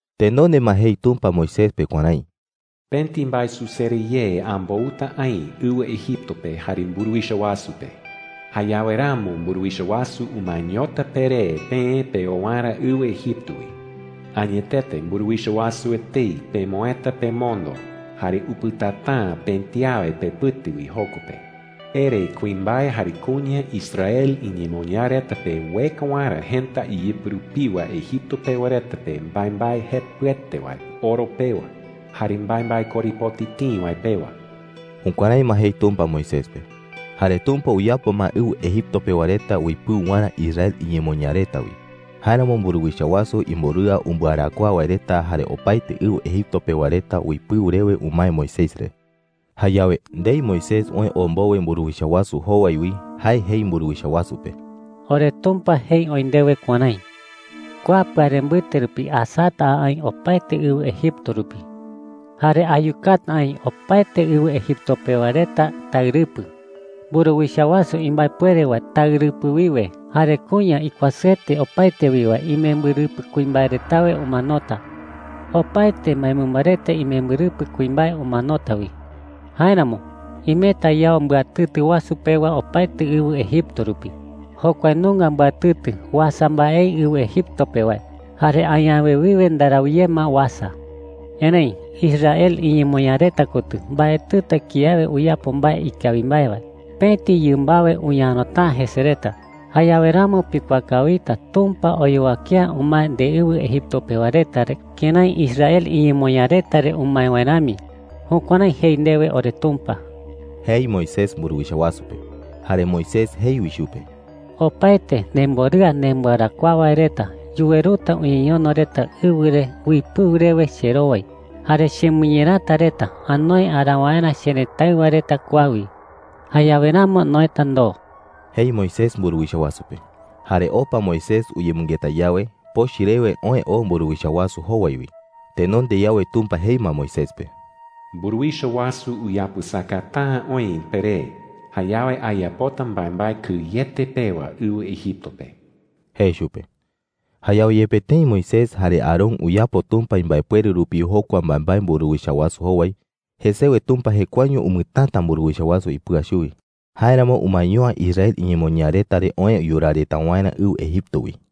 Tenonde ma jei Tumpa Moisés pe kuärái: “Pëti mbaesusere ye ambouta aï ɨwɨ Egipto pe jare mburuwicha wasu pe. Jayawe ramo mburuwicha wasu umaeñota peré peë peo waerä ɨwɨ Egipto wi. Añetete mburuwicha wasu etei pemoëta pemondo, jare upɨtata’ä pëti awe pepɨte wi joko pe,” jei. “Ere kuimbae jare kuña Israel iñemoñaa reta pe ueka waerä jëta iyɨpɨ rupiwa Egipto pewa reta pe mbaembae jepɨete wae oro pewa jare mbaembae korepoti tïi wae pewa.” Jukuärái ma jei Tumpa Moisés pe. Jare Tumpa uyapo ma ɨwɨ Egipto pewa reta uipɨu waerä Israel iñemoñaa reta wi. Jáeramo mburuwicha wasu imborɨa umbɨarakuaa wae reta jare opaete ɨwɨ Egipto pewa reta uipɨu rewe umae Moisés re. Jayawe, ndei Moisés oë oo mbowe mburuwicha wasu jowai wi, jae jei mburuwicha wasu pe: “OreTumpa jei oï ndewe kuärái: ‘Kua pɨare mbɨte rupi asata a aï opaete ɨwɨ Egipto rupi. Jare ayukata aï opaete ɨwɨ Egipto pewa reta taɨrɨpɨ. Mburuwicha wasu imbaepuere wae taɨrɨpɨ wiwe jare kuña ikuasɨete opaete wi wae imembɨrɨpɨ kuimbae retawe umanota. Opaete mbaemɨmba reta imembɨrɨpɨ kuimbae umanota wi. Jáeramo imeta yao mbɨatɨtɨ wasu pewa opaete ɨwɨ Egipto rupi. Jokua nunga mbɨatɨtɨ uasa mbaei ɨwɨ Egipto pe wae, jare añawe wiwe ndarau ye ma uasa. Erëi Israel iñemoñaa reta kotɨ mbaetɨta kiawe uyapo mbae ikawi mbae wae. Pëti yɨmbawe uñarota’ä jese reta. Jayawe ramo pikuaa kawita Tumpa oyowake’ä umae ndeɨwɨ Egipto pewa reta re kërái Israel iñemoñaa reta re umae wae rami.’ Jukuärái jei ndewe oreTumpa,” jei Moisés mburuwicha wasu pe. Jare Moisés jei wi chupe: “Opaete nemborɨa nembɨarakuaa wae reta yuweruta uñeñono reta ɨwɨ re uipɨu rewe cherowai. Jare chemɨñerata reta anoe araa waerä cherëtáɨwa reta kua wi. Jayawe ramo noëta ndoo,” jei Moisés mburuwicha wasu pe. Jare opa Moisés uyemɨngeta yawe, pochɨ rewe oë oo mburuwicha wasu jowai wi. Tenonde yawe Tumpa jei ma Moisés pe: “Mburuwicha wasu uyapɨsakata’ä oï peré. Jayawe ayapota mbaembae kɨyete pewa ɨwɨ Egipto pe,” jei chupe. Jayawe yepe tëi Moisés jare Aarón uyapo Tumpa imbaepuere rupi jokua mbaembae mburuwicha wasu jowai, jesewe Tumpa jekuaeño umɨtäta mburuwicha wasu ipɨa chuwi. Jáeramo umaeño’ä Israel iñemoñaa reta re oë yuraa reta waerä ɨwɨ Egipto wi.